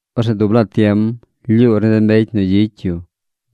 Orzeꞌ dub laa tiem lyuur ni de mbecy nu gyicy yu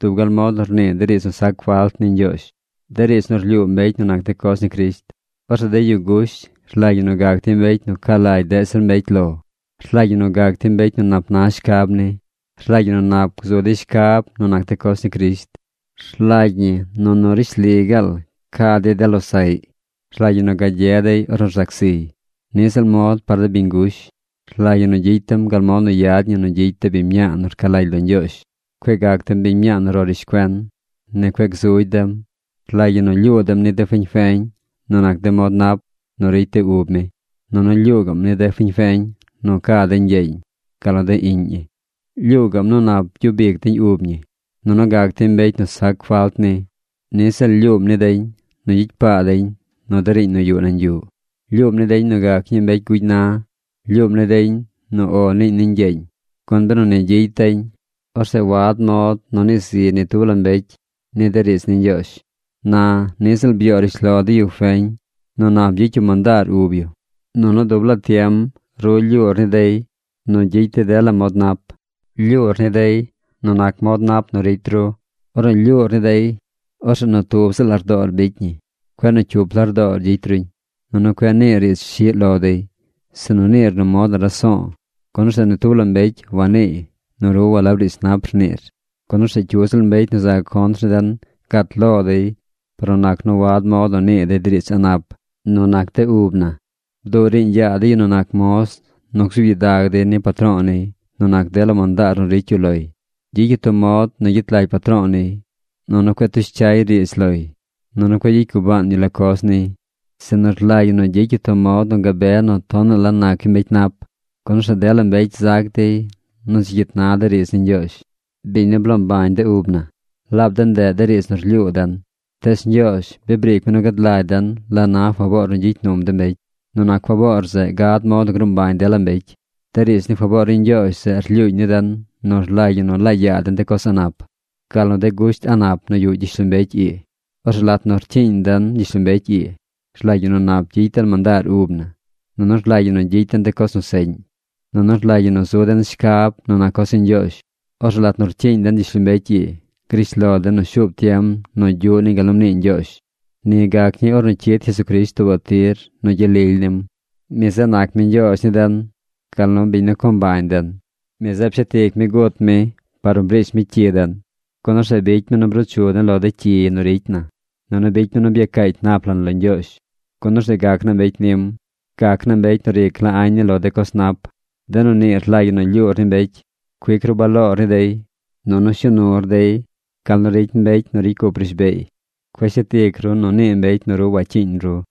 dub gal mod nu rnii de riidz nu sac falt ni Ñgyoozh, de riidz nu rlyuu mbecy nu nac de coz ni Crisht. Orzeꞌ de yu gush rlagy ñi nu gac dey mbecy nu ca lagy deꞌ zir mbecy lo. Rlagy ñi nu gac dey mbecy nu nap na shcab ni. Rlagy ñi nu nap gzu dey shcab nu nac de coz ni Crisht. Rlagy ñi nu nu rishli gaal ca dey de losaꞌy. Rlagy ñi nu gagye dey ornu rzac ziy. Niꞌ ziꞌl mod par de biñ gush. Rlagy ñi nu gyicy dem gal mod nu yad ñi nu gyicy de biñ mñaa nu rca lagy lo Ñgyoozh. Cueꞌ gac dem biñ mñaa nu ro rishcuen. Ni cueꞌ gzugy dem. Rlagy ñi lyuu dem ni de fiñ feñ nu nac de mod nap nu ricy de ub mi. Nunu lyuu gaꞌm ni de fiñ feñ nu ca deñ ñgyeeñ gal nu de iꞌñ ñi. Lyuu gaꞌm nu nap gyub ic deñ ub ñi, nunu gac deñ mbecy nu sac falt ni. Niꞌ ziꞌl lyuum ni deñ nu gyicy paa deñ nu de riiñ nu yuꞌ nañ yuꞌ. Lyuum ni deñ nu gac ñii mbecy gugy na. Lyuum ni deñ nu “O” niiñ ni ñgyeeñ. Gun benu ni gyicy deñ, orzeꞌ wad mod nu nii zi ni tub la mbecy ni de riidz ni Ñgyoozh. Na niꞌ ziꞌl byoo rishlo de yu feñ nu nap gyicy yu mandaar ub yu. Nunu dub laa tiem ru lyuur ni dey nu gyicy dey dela mod nap. Lyuur ni dey nu nac mod nu ricy ru. Ornu lyuur ni dey, orzeꞌ nu tub ziꞌl lardoor bicy ñi. Cueꞌ nu cyup lardoor gyicy ruñ. Nunu cueꞌ niir riidz shiꞌ lo dey, sinu niir nu mod nu raso̱o̱, gun orzeꞌ ni tub la mbecy waniiy nu ru walab riidz nap rniir, gun orzeꞌ cyu ziꞌl mbecy nu za contr ni den gat lo dey par nu nac nu wad mod nu nii dey riidz a̱ꞌ nap nu nac de ub na. Bduꞌ riiñ yaa de yu nu nac moz nu gzuub gyidag dey ni patro̱o̱ niy nu nac dela mandaar nu ricy yu loy. Gyicy yu tub mod nu gyet lagy patro̱o̱ niy. Nunu cueꞌ tush cyay riidz loy. Nunu cueꞌ gyicy gubaan yu la coz niy, sinu rlagy ñi nu gyicy yu tub mod nu gabe nu tonaꞌ la nac yu mbecy nap, gun orzeꞌ dela mbecy zac dey nu dzi cyit na de riidz ni Ñgyoozh, biñ nu bloo mbañ de ub na. Laab de ndeꞌ de riidz nu rlyuu den. Tees Ñgyoozh bi briic mi nu gad lagy den la na faboor nu gyicy num de mbecy. Nu nac faboor zeꞌ gad mod nu gruu mbañ dela mbecy. De riidz ni faboor ni Ñgyoozh zeꞌ rlyuuñ ni den nu rlagy ñi nu laa yaa den de coz a̱ꞌ nap, gal nu de gusht a̱ꞌ nap nu yuꞌ gyishlombecy ii. Orzeꞌ lat nu rcyiiñ den gyishlombecy ii rlagy ñi nu nap gyicy den mandaar ub na. Nunu rlagy ñi nu gyicy den de coz nu seꞌñ. Nunu rlagy ñi nu zu den shcab nu nac coz ni Ñgyoozh. Orzeꞌ lat nu rcyiiñ den gyishlombecy ii, grish lo den nu shuub tiem nu gyuꞌ niñ gal nu mnii Ñgyoozh. Ni gac ñii ornu cyid Jesucrisht tuubaꞌ tir nu gyel lily nim. Mi zeꞌ nac mi Ñgyoozh ni den gal nu biñ nu co mbañ den. Mi zeꞌ pshet ic mi gut mi par nu briish mi cyi den, gun orzeꞌ bicy mi nu bruu chu den lo de cyi nu ricy na. Nunu bicy mi nu byacaacy nap lan lo Ñgyoozh, gun orzeꞌ gac na mbecy nim. Gac na mbecy nu ric la añ ni lo de coz nap. De nu nii rlagy ñi nu lyuur ni mbecy. Cuic ru baloor ni dey. Nunu shuu nur dey gal nu ricy mbecy nu ricy cup rishbeey. Cueꞌ shet ic ru nu nii mbecy nu ru wacyiiñ ru.